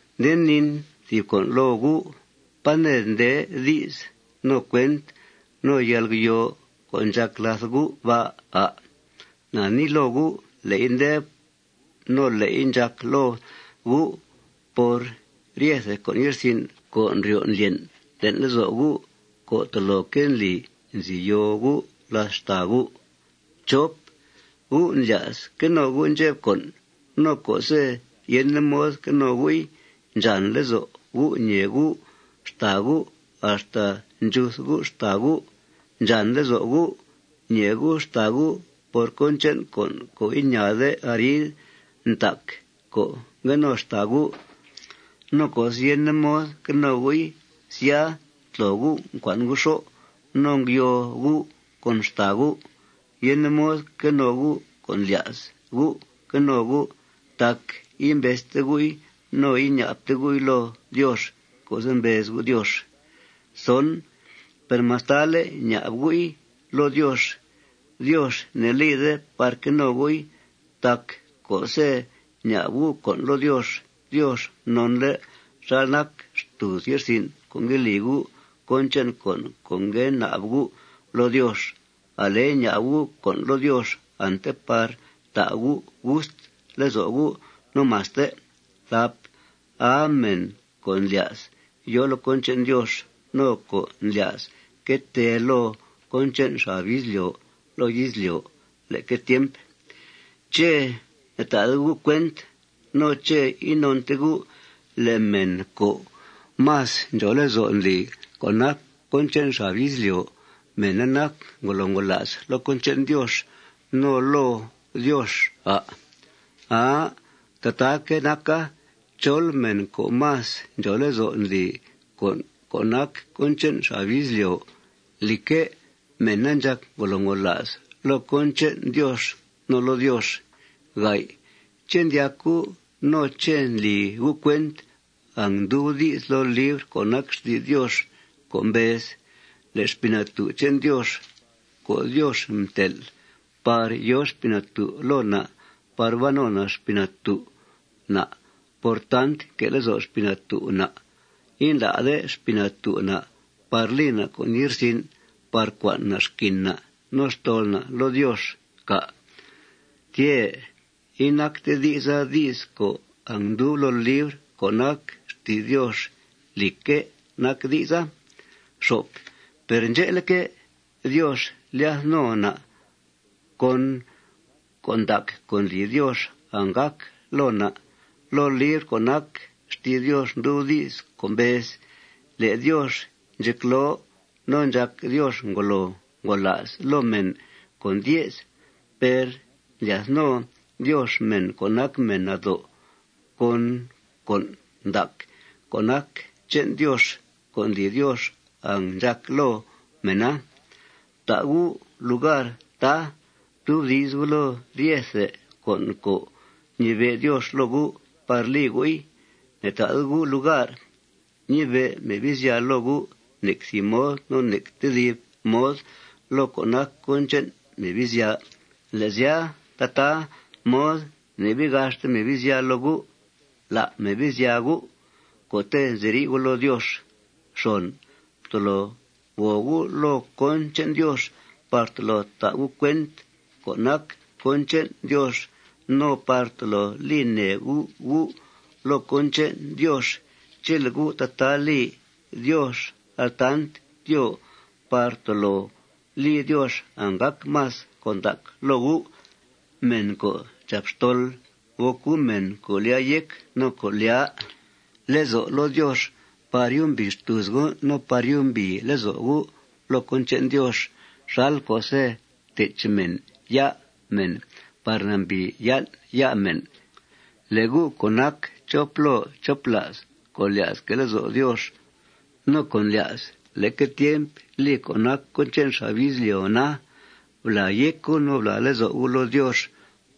Nde niin thìb con' loo gu': ¿Pá ned nde di's no cuent no yalgyoo co' ndxàc làth gu' ba', à'? Na nii loo gu': Le'i nde no le'i ndxàc loo gu' por ryethe con' ye'rsin' co' ndryo' ndlyen' le'n lezo' gu' co' toloque' ndli nzi yoo gu' làth xtàa gu'. Gu' ndlya's que no gu' ndxep con'. No co'se' yende mod que no gu'i, ndxàn lezo' gu' ñèe gu' xtàa gu' axta ndxuth gu' xtàa gu'. Ndxàn lezo' gu' ñèe gu' xtàa gu' por cón che'n con' co' iñaade arid ntac co' ngue no xtàa gu'. No co'se' yende mod que no gu'i, sya, ntlo gu', ncua'n gu' xó' no ngyoo gu' con xtàa gu'. Yende mod que no gu' co' ndlya's gu' que no gu' tac imbezte gu'i no iña'bte gu'i loo Diox co'se' mbez gu' Diox. Per mastale' ña'b gu'i loo Diox, Diox ne'lide par que no gu'i. Tac co'se' ña'b gu' con' loo Diox, Diox nonle' xal nac xtùuz ye'rsin' co' ngue li gu' cón che'n con' ngue na'b gu' loo Diox. Ale ña'b gu' con' loo Diox ante par ta' gu' gust lezo' gu' no maste. ¡Aa mèn co' ndlya's yòo loo cón che'n Diox no co' ndlya's que tee loo cón che'n xab izlyo' loo izlyo' leque tiemp! ¿Ché' ne'ta'de gu' cuent no ché' inonte gu' le' mèn co' más ndxòo lezo' ndli co' nac cón che'n xab izlyo', mèna nac ngolo ngola's loo cón che'n Diox no loo Diox, à'? Aa. Tataaque' naca. Chol mèn co' más ndxòo lezo' ndli con' co' nac cón che'n xab izlyo', lìcque', mèna ndxàc ngolo ngola's loo cón che'n Diox no loo Diox. ¿Ché' ndyac gu' no ché' ndli gu' cuent angndub di's loo libr co' nac xti's Diox co' mbez: Le' Xpii Natú' che'n Diox co' Diox mtel' par yòo Xpii Natú' loo na' par ban no Xpii Natú' na' por tant nque' lezo' Xpii Natú' na', indlá'de Xpii Natú' na' par li na' con' ye'rsin' par cua'n na' xquin na' no xtol na' loo Diox, cà'? Tyè'. Inacte di'sa di's co' angndub loo libr co' nac xti's Diox. Lìcque' nac di'sa. Per ndxe'leque', Diox ndlyath no na' con con' ndac co' ndli Diox anggàc loo na'. Loo libr co' nac xti's Diox ndub di's co' mbez: Le' Diox ndxecloo no ndxàc Diox ngolo ngola's loo mèn co' ndye's. Per ndlyath no Diox mèn co' nac mèn nado' con con' ndac co' nac che'n Diox co' ndli Diox angndxàc loo mèna. Fta' gu' lugar, tá, ftubdi's gu' loo ryethe con' co' ñibe' Diox loo gu' par li gu'i. Ne'ta'de gu' lugar ñibe' Mebizya loo gu' nec thìb mod no nec tedib mod loo co' nac cón che'n Mebizya. Le' sya, tataa mod ne'bii gaxte Mebizya loo gu'. Lá' Mebizya gu' co'te' nziri' gu' loo Diox. Ftolo gòo gu' loo cón che'n Diox par tolo ta' gu' cuent cón nac cón che'n Diox no par tolo li nèe gu' gu' loo cón che'n Diox. Chele' gu' tataa li, Diox altant tyoo par tolo li Diox anggàc más con' ndac loo gu'. Mèn co' ndxàp xtol, gòc gu' mèn co' lyàa yéc no co' lyàa lezo' loo Diox par yumbìi xtùuz gu' no par yumbìi lezo' gu' loo cón che'n Diox xal co'se' tech mèn ya' mèn par nambìi yan' ya' mèn. Le' gu' co' nac chop loo chop la's co' lya's que' lezo' Diox no co' ndlya's leque tiemp li co' nac cón che'n xab izlyo' na, blàa yéc gu' no blàa lezo' gu' loo Diox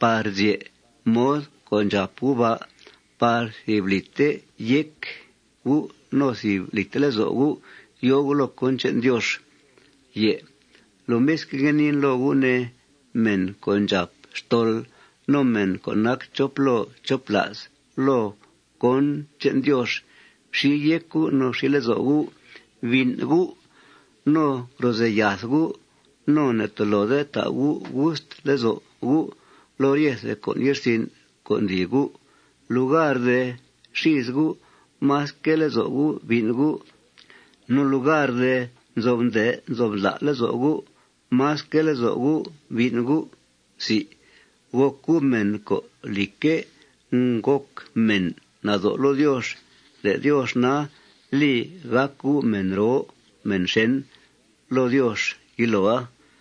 par zye' mod co' ndxàp gu' ba' par thìb lìte yéc gu' no thìb lìte lezo' gu' yòo gu' loo cón che'n Diox. Lomisque', ngue niin loo gu', ne, mèn co' ndxàp xtol no mèn co' nac chop loo chop la's loo cón che'n Diox: Fxi yéc gu' no fxi lezo' gu'. Bín' gu' no grozèe yath gu'. No ne'tolode ta' gu' gust lezo' gu' loo ryethe con' ye'rsin' co' ndli gu'. Lugar de xìis gu', más quee lezo' gu' bín' gu'. No lugar de nzo'f nde' nzo'f ndla' lezo' gu', más quee lezo' gu' bín' gu'. Gòc gu' mèn co', lìcque', ngòc mèn nado' loo Diox. Le' Diox na, li gàc gu' mèn roo mèn xèn loo Diox yiloa.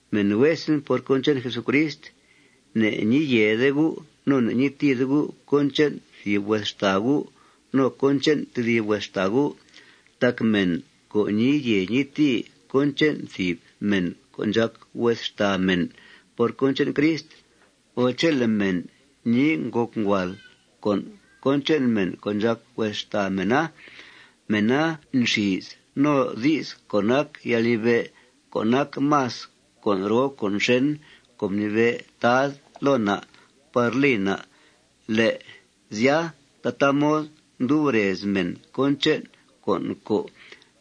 Mèn huesen por cón che'n Jesucrist, ne'ñii yèede gu' no ne'ñii tìide gu' cón che'n thìb hues xtàa gu' no cón che'n tedib hues xtàa gu'. Tac mèn co' ñii yèe ñii tìi cón che'n thìb mèn co' ndxàc hues mèn por cón che'n Crist, o chele' mèn nii ngòc nguàal con' cón che'n mèn co' ndxàc hues xtàa mèna, mèna nxìis no di's co' nac yalnibe' co' nac más con' roo con' xèn co' mnibe' Tad loo na' par li na'. Le' sya, tataa mod ndub rez mèn cón che'n con' co'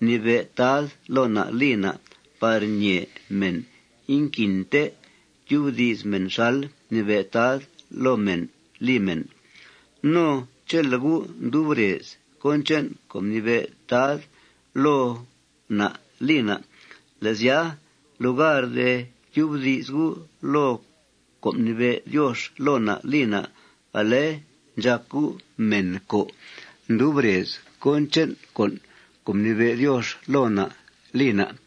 mnibe' Tad loo na' li na' par ñee mèn inquinte tyubdi's mèn xal mnibe' Tad loo mèn li mèn. No chele' gu' ndub rez cón che'n co' mnibe' Tad loo na' li na', le' sya, lugar de tyubdi's gu' loo con' mnibe' Diox loo na' li na', ale ndxàc gu' mèn co' ndub rez cón che'n con' co' mnibe' Diox loo na' li na'.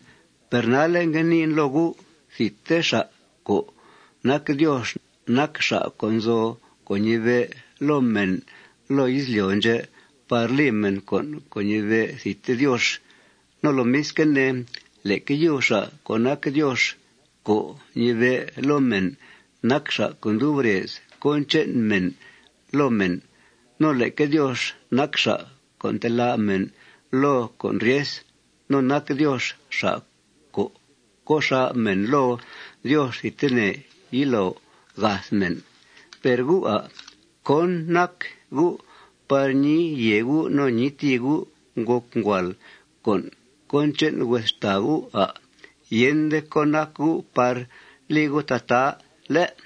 Per nalle' ngue niin loo gu': Thidte xa' co' nac Diox nac xa' co' nzo co' ñibe' loo mèn loo izlyo' ndxè' par li mèn con' co' ñibe' thidte Diox. No lomisque' ne, leque yub xa' co' nac Diox co' ñibe' loo mèn, nac xa' co' ndub rez cón che'n mèn loo mèn. No leque Diox nac xa' co' ntelá' mèn loo con' ryes. No nac Diox xa' co' co' xà' mèn loo Diox thidtene yilo gath mèn. ¿Per gu', à'? ¿Cón nac gu' par ñii yèe gu' no ñii tìi gu' ngòc nguàal con' cón che'n hues xtàa gu', à'? Yende cón nac gu' par li gu' tataa, ¿lé'?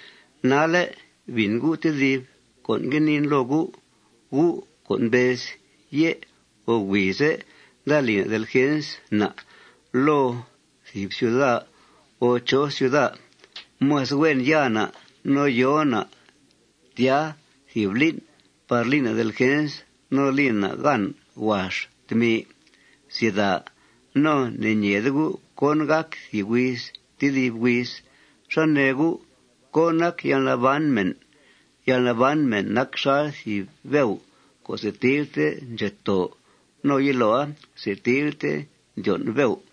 Nalle', bìn gu' tedib con' ngue niin loo gu': Gu' co' mbez: Yé' o huize' nda li na' delgens na' loo thìb ciuda o chó cuida. Más huen ya na' no yo na' tya thìb lín' par li na' delgens no li na' gan huax tmi. No ne'ñeede gu' cón gàc thìb huiz tedib huiz. ¿Xá nee gu'? ¿Cón nac yalnaban mèn? Yalnaban mèn nac xal thìb beu co' setilte ndxetoo. No yiloa, setilte ndyon' beu.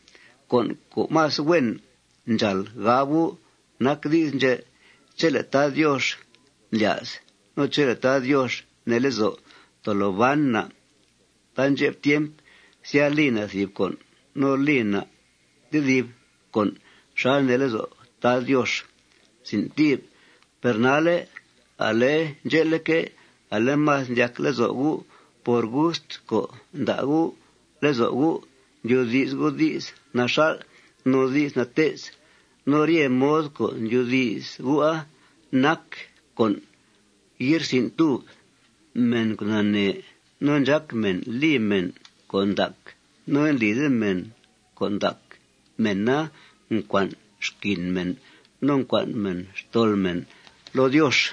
Con' co' más huen ndxàal gab gu' nac di's ndxè': Chele' Tad Diox ndlya's no chele' Tad Diox nee lezo', tolo ban na' taandxep tiemp. Sya, li na' thìb con' no li na' tedib con' xal nee lezo' Tad Diox. Per nalle', ale ndxe'leque', ale más ndyac lezo' gu' por gust co' nda' gu' lezo' gu', ndyoodi's gu' di's naxal' no di's nate's. No rye mod co' ndyoodi's gu'a nac con' ye'rsin'túb. Mèn co' nanee no ndxác mèn li mèn con' ndac no indlide mèn con' ndaca, mèna ncua'n xquin mèn no ncua'n mèna xtol mèn loo Diox.